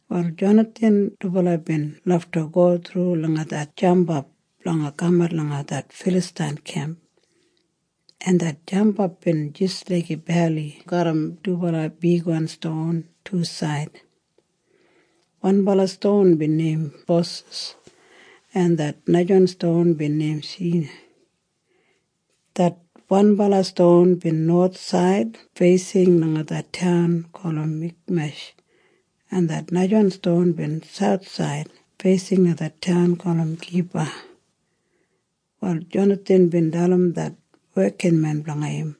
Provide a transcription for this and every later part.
Wal Jonathan dubala bin lafta go thru langa det jampap blanga kamat langa det Filastain kemp, en det jampap bin jis laiga beli garram dubala bigwan ston tusaid. Wanbala ston bin neim Boses, en det najawan ston bin neim Sene. Det wanbala ston bin nowathsaid feising langa det taun gulum Mikmesh, en det najawan ston bin sauthsaid feising langa det taun gulum Geba. Wal Jonathan bin dalim det wekinmen blanga im,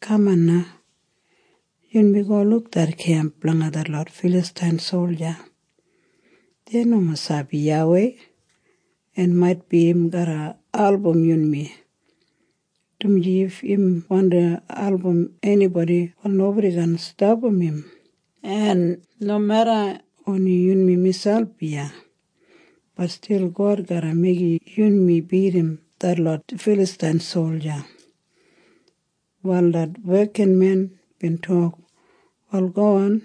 “Kaman na. Yunmi go luk det kemp blanga detlot Filastain solja. Dei nomo sabi YAWEI, en maitbi im garra album yunmi, dumaji if im wandi album enibodi, wal nobodi kaan stapam im. En nomeda oni yunmi miselp iya, bat stil God garra meigim yunmi bidim detlot Filastain solja.” Wal det wekinmen bin tok, “Wal gowan.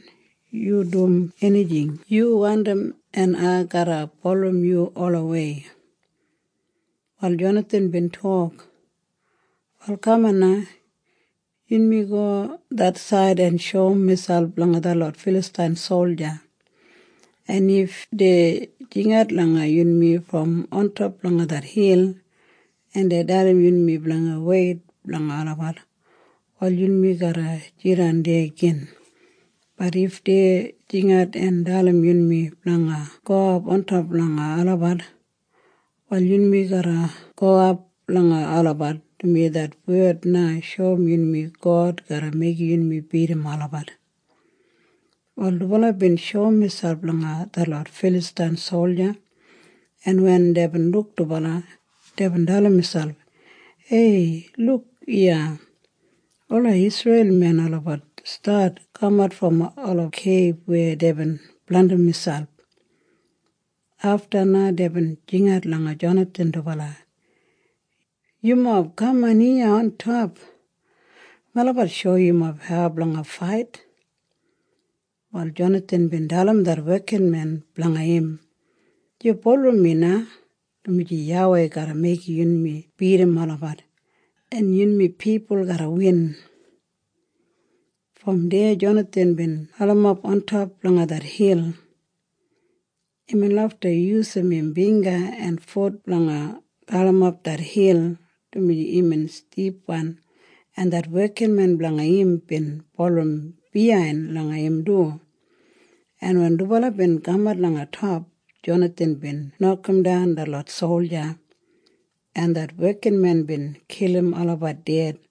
Yu dum enijing yu wandim, en ai garra bulurrum yu olawei.” Wal Jonathan bin tok, “Wal kaman na. Yunmi go det said en shoum miselp langa detlot Filastain solja, en if dei jingat langa yunmi brom ontop langa det hil, en dei dalim yunmi blanga weit blanga olabat, wal yunmi garra jidan deya gin. Bat if dei jingat en dalim yunmi blanga gowap ontop langa olabat, wal yunmi garra gowap langa olabat, dumaji det wed na shoum yunmi God garra meigim yunmi bidim olabat.” Wal dubala bin shoum miselp langa detlot Filastain solja, en wen deibin luk dubala, deibin dalim miselp, “Hei luk iya! Ola Isreil men olabat stat kamat brom ola keib weya deibin blandim miselp!” Afta na deibin jingat langa Jonathan dubala, “Yumob kaman iya ontop. Melabat shoum yumob hau blanga fait.” Wal Jonathan bin dalim det wekinmen blanga im, “Yu bulurrum mi na, dumaji YAWEI garra meigim yunmi bidim olabat, en yunmi pipul garra win.” Brom deya Jonathan bin galimap ontop langa det hil. Imbin lafta yusum im bingga en fut blanga galimap det hil, dumaji imbin stipwan, en det wekinmen blanga im bin bulurrum biyain langa im du, en wen dubala bin kamat langa top, Jonathan bin nokamdan detlot solja, en det wekinmen bin kilim olabat ded.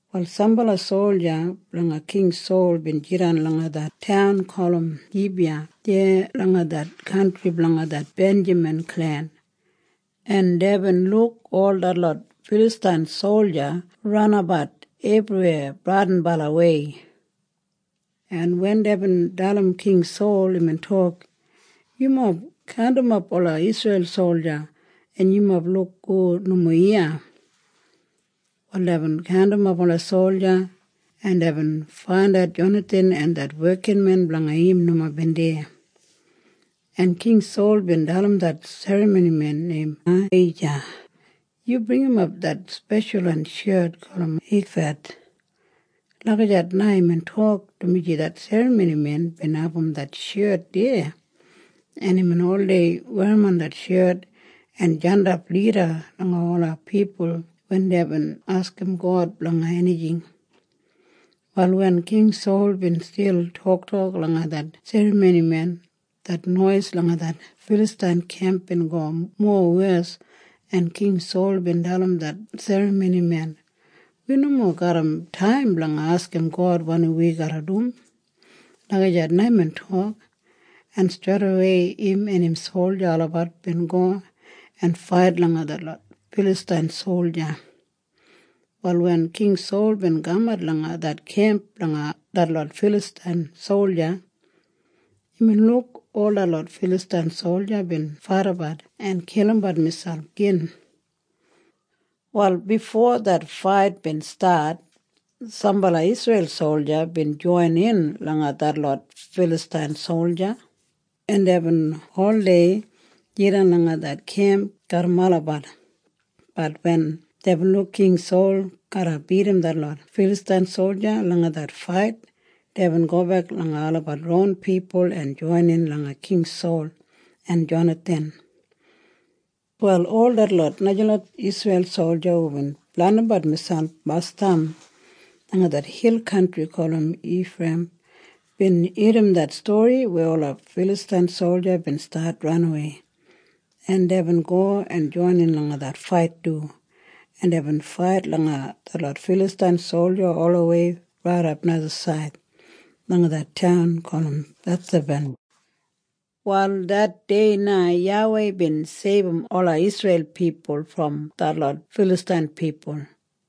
Wal sambala solja blanga King Sol bin jidan langa det taun gulum Gibiya deya langa det kantri blanga det Benjamin klen, en deibin luk ol detlot Filastain solja ranabat ebriweya bradinbalawei, en wen deibin dalim King Sol, imbin tok, “Yumob kaundimap ola Isreil solja, en yumob luk hu nomo iya.” Wal deibin kaundimap ola solja, en deibin faindat Jonathan en det wekinmen blanga im nomo bin deya, en King Sol bin dalim det serramonimen neim Ahija, “Yu bringimap det speshalwan shet gulum ifad.” Lagijat na imbin tok, dumaji det serramonimen bin abum det shet deya, en imbin oldei werrimon det shet en jandap lida langa ola pipul wen deibin askim God blanga enijing. Wal wen King Sol bin stil toktok langa det serramonimen, det nois langa det Filastain kemp bin go mowes, en King Sol bin dalim det serramonimen, “Wi nomo garram taim blanga askim God wanim wi garra dum.” Lagijat na imbin tok, en streidawei im en im solja olabat bin go en fait langa detlot Filastain solja. Wal wen King Sol bin kamat langa det kemp blanga detlot Filastain solja, imbin luk ol detlot Filastain solja bin faidabat en kilimbat miselp gin. Wal bifo det fait bin stat, sambala Isreil solja bin joinin langa detlot Filastain solja, en deibin oldei jidan langa det kemp garram olabat. Bat wen deibin luk King Sol garra bidim detlot Filastain solja langa det fait, deibin gobek langa olabat ron pipul en joinin langa King Sol en Jonathan. Wal ol detlot najalot Isreil solja hubin blandimbat miselp basdam langa det hil kantri gulum Ifreiyim bin irrim det stori weya ola Filastain solja bin stat ranawei, en deibin go en joinin langa det fait du, en deibin fait langa detlot Filastain solja olawei raidap najasaid langa det taun gulum Bethaben. Wal det dei na YAWEI bin seibum ola Isreil pipul brom detlot Filastain pipul.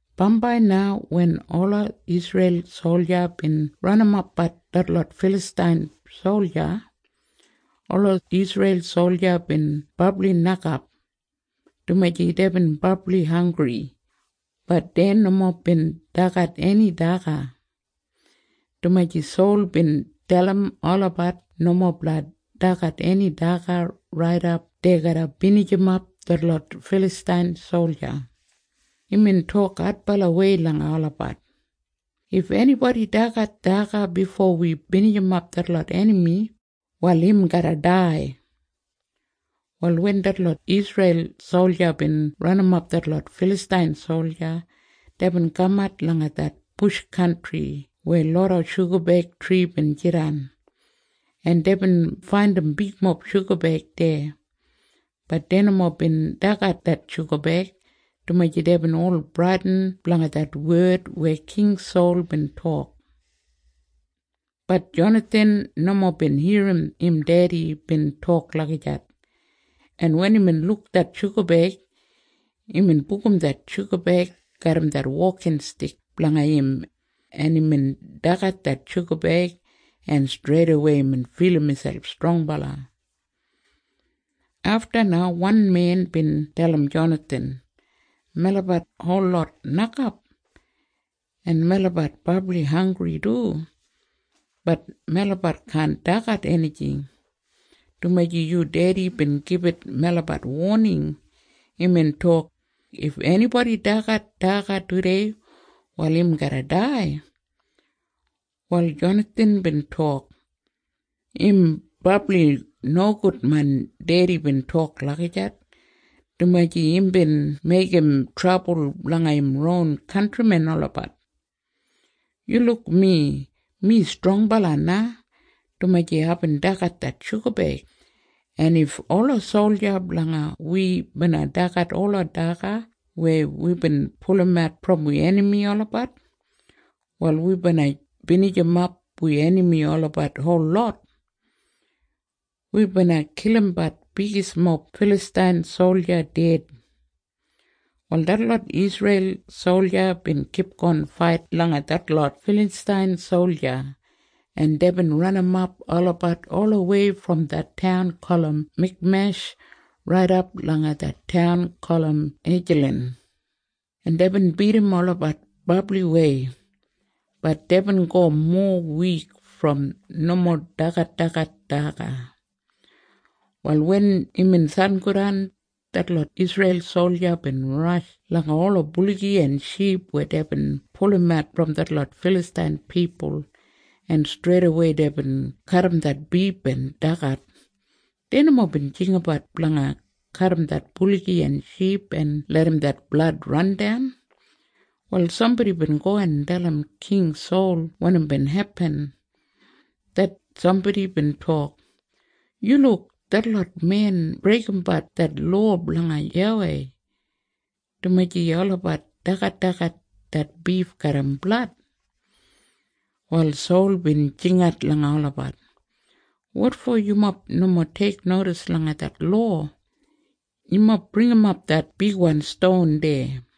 Bambai na wen ola Isreil solja bin ranimapbat detlot Filastain solja, ola Isreil solja bin brabli nokap, dumaji deibin brabli hanggri. Bat dei nomo bin dagat eni daga, dumaji Sol bin dalim olabat nomo blanga dagat eni daga raidap dei garra binijimap detlot Filastain solja. Imbin tok adbalawei langa olabat, “If enibodi dagat daga bifo wi binijimap detlot enami, wal im garra dai.” Wal wen detlot Isreil solja bin ranimap detlot Filastain solja, deibin kamat langa det bush kantri weya loda shugabeig tri bin jidan, en deibin faindim bigmob shugabeig deya. Bat dei nomo bin dagat det shugabeig, dumaji deibin ol bradin blanga det wed weya King Sol bin tok. Bat Jonathan nomo bin irrim im dedi bin tok lagijat, en wen imbin luk det shugabeig, imbin bugum det shugabeig garram det wokinstik blanga im, en imbin dagat det shugabeig, en streidawei imbin filim miselp strongbala. Afta na wan men bin dalim Jonathan, “Melabat holot nokap, en melabat brabli hanggri du. Bat melabat kaan dagat enijing, dumaji yu dedi bin gibit melabat woning. Imbin tok, ‘If enibodi dagat daga tudei, wal im garra dai.’” Wal Jonathan bin tok, “Im brabli nogud main dedi bin tok lagijat, dumaji imbin meigim trabul blanga im ron kantrimen olabat. Yu luk mi. Mi strongbala na, dumaji aibin dagat det shugabeig, en if ola solja blanga wi bina dagat ola daga weya wibin pulumat brom wi enami olabat, wal wi bina binijimap wi enami olabat holot. Wi bina kilimbat bigismob Filastain solja ded.” Wal detlot Isreil solja bin kipgon fait langa detlot Filastain solja, en deibin ranimap olabat olawei brom det taun gulum Mikmesh raidap langa det taun gulum Ejalan, en deibin bidim olabat brabliwei. Bat deibin go mowa wik brom nomo dagadagat daga. Wal wen imbin sangodan, detlot Isreil solja bin rash langa ola buligi en ship weya deibin pulumat brom detlot Filastain pipul, en streidawei deibin kadim det bif en dagat. Dei nomo bin jinggabat blanga kadim det buligi en ship en larram det blad randan. Wal sambodi bin go en dalim King Sol wanim bin hepin. Det sambodi bin tok, “Yu luk. Detlot men breigimbat det lowa blanga YAWEI, dumaji olabat dagadagat det bif garram blad.” Wal Sol bin jingat langa olabat, “Wotfo yumob nomo teiknodis langa det lowa? Yumob bringimap det bigwan ston deya.”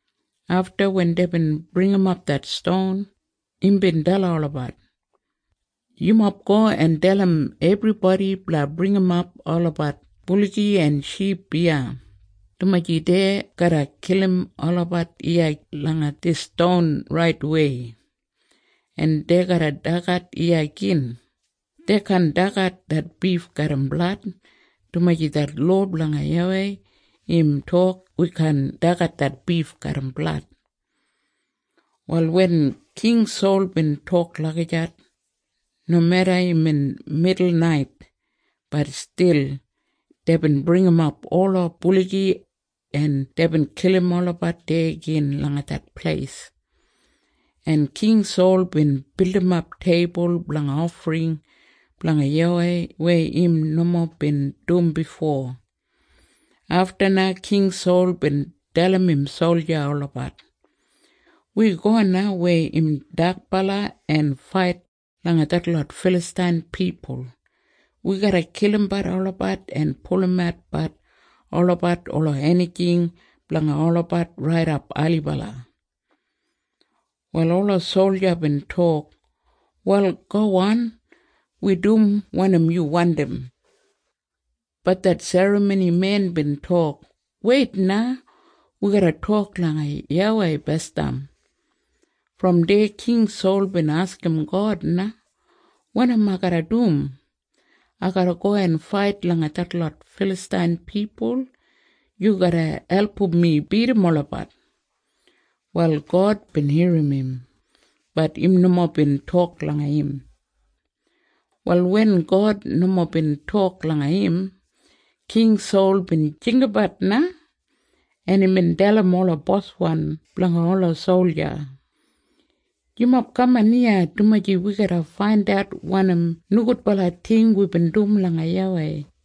Afta wen deibin bringimap det ston, imbin dalim olabat, “Yumob go en dalim ebribodi blanga bringimap olabat buligi en ship iya, dumaji dei garra kilim olabat iya langa dis ston raitwei, en dei garra dagat iya gin. Dei kaan dagat det bif garram blad, dumaji det lowa blanga YAWEI im tok wi kaan dagat det bif garram blad.” Wal wen King Sol bin tok lagijat, nomeda imbin midulnait, bat stil deibin bringimap ola buligi, en deibin kilim olabat deya gin langa det pleis, en King Sol bin bildimap teibul blanga ofring blanga YAWEI weya im nomo bin dum bifo. Afta na King Sol bin dalim im solja olabat, “Wi go na weya im dakbala en fait langa detlot Filastain pipul. Wi garra kilimbat olabat en pulumatbat olabat ola enijing blanga olabat raidap ailibala.” Wal ola solja bin tok, “Wal gowan. Wi dum wanim yu wandim.” Bat det serramonimen bin tok, “Weit na. Wi garra tok langa YAWEI basdam.” Brom deya King Sol bin askim God na, “Wanim ai garra dum? Ai garra go en fait langa detlot Filastain pipul? Yu garra album mi bidim olabat?” Wal God bin irrim im. Bat im nomo bin tok langa im. Wal wen God nomo bin tok langa im, King Sol bin jinggabat na, en imbin dalim ola boswan blanga ola solja, “Yumob kaman iya, dumaji wi garra faindat wanim nogudbala ting wibin dum langa YAWEI.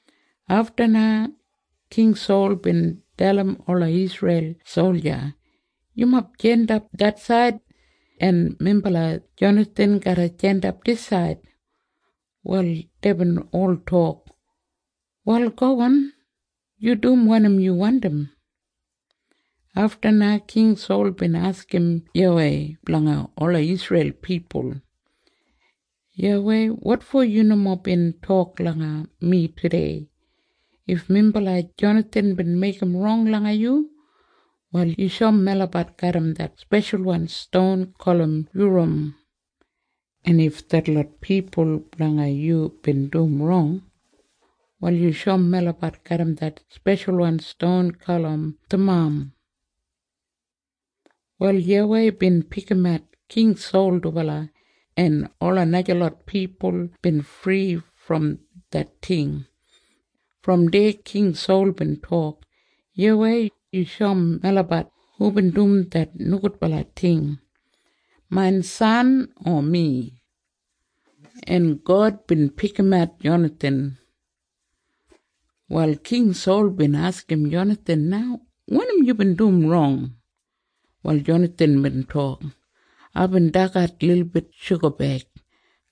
Afta na King Sol bin dalim ola Isreil solja, “Yumob jandap det said, en minbala Jonathan garra jandap disaid.” Wal deibin ol tok, “Wal gowan. Yu dum wanim yu wandim.” Afta na King Sol bin askim YAWEI blanga ola Isreil pipul, “YAWEI, wotfo yu nomo bin tok langa mi tudei? If minbala Jonathan bin meigim rong langa yu, wal yu shoum melabat garram det speshalwan ston gulum Yuram. En if detlot pipul blanga yu bin dum rong, wal yu shoum melabat garram det speshalwan ston gulum Thamam.” Wal YAWEI bin pikimat King Sol dubala, en ola najalot pipul bin fri brom det ting. Brom deya King Sol bin tok, “YAWEI, yu shoum melabat hubin dum det nogudbala ting. Main san o mi?” En God bin pikimat Jonathan. Wal King Sol bin askim Jonathan na, “Wanim yubin dum rong?” Wal Jonathan bin tok, “Aibin dagat lilbit shugabeig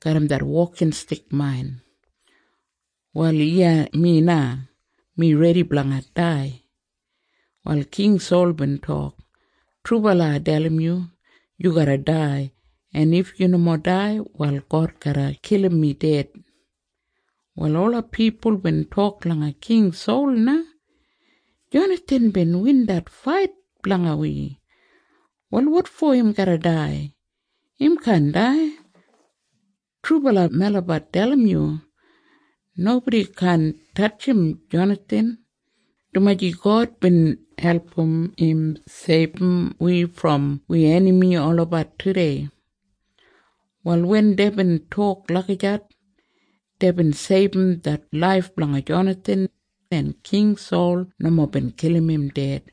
garram det wokinstik main. Wal iya mi na. Mi redi blanga dai.” Wal King Sol bin tok, “Trubala ai dalim yu. Yu garra dai. En if yu nomo dai, wal God garra kilim mi ded.” Wal ola pipul bin tok langa King Sol na, “Jonathan bin win det fait blanga wi. Wal wotfo im garra dai? Im kaan dai. Trubala melabat dalim yu. Nobodi kaan tatjim Jonathan, dumaji God bin album im seibum wi brom wi enami olabat tudei.” Wal wen deibin tok lagijat, deibin seibum det laif blanga Jonathan, en King Sol nomo bin kilim im ded.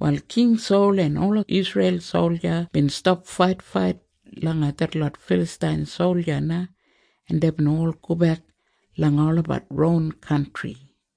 Wal King Sol en ola Isreil solja bin stap faitfait langa detlot Filastain solja na, en deibin ol gobek langa olabat ron kantri.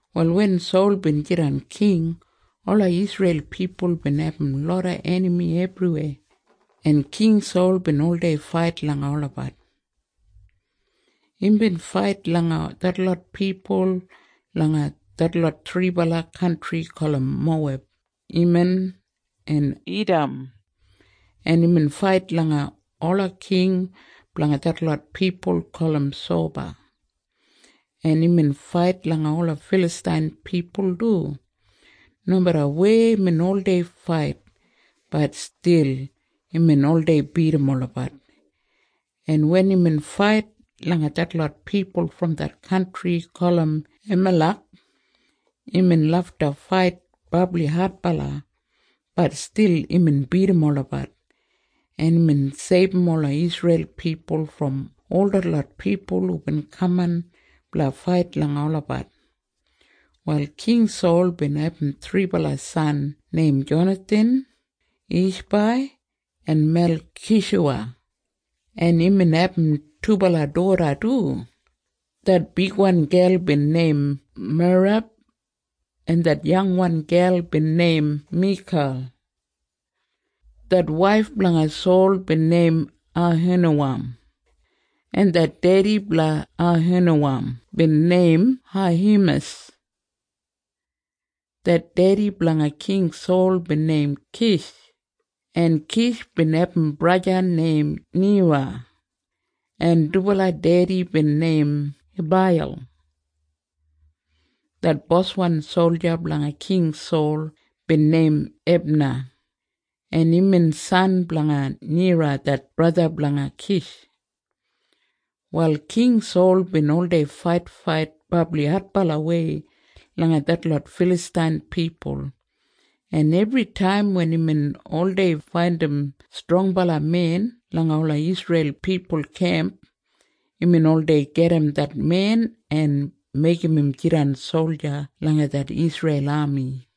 Wal wen Sol bin jidan king, ola Isreil pipul bin abum loda enami ebriweya, en King Sol bin oldei fait langa olabat. Imbin fait langa detlot pipul langa detlot thribala kantri gulum Moweb, Eman en Idam, en imbin fait langa ola king blanga detlot pipul gulum Soba, en imbin fait langa ola Filastain pipul du. Nomeda weya imbin oldei fait, bat stil imbin oldei bidim olabat, en wen imbin fait langa detlot pipul brom det kantri gulum Amalek, imbin lafta fait brabli adbala. Bat stil imbin bidim olabat, en imbin seibum ola Isreil pipul brom ol detlot pipul hubin kaman blanga fait langa olabat. Wal King Sol bin abum thribala san neim Jonathan, Ishbai en Melkishuwa, en imbin abum dubala doda du. Det bigwan gel bin neim Merab, en det yangwan gel bin neim Mikal. Det waif blanga Sol bin neim Ahinowam, en det dedi blanga Ahinowam bin neim Ahimas. Det dedi blanga King Sol bin neim Kish, en Kish bin abum braja neim Nera, en dubala dedi bin neim Abaiyel. Det boswan solja blanga King Sol bin neim Ebna, en imbin san blanga Nera det braja blanga Kish. Wal King Sol bin oldei faitfait brabli adbalawei langa detlot Filastain pipul, en ebritaim wen imbin oldei faindim strongbala men langa ola Isreil pipul kemp, imbin oldei gedim det men en meigim im jidan solja langa det Isreil ami.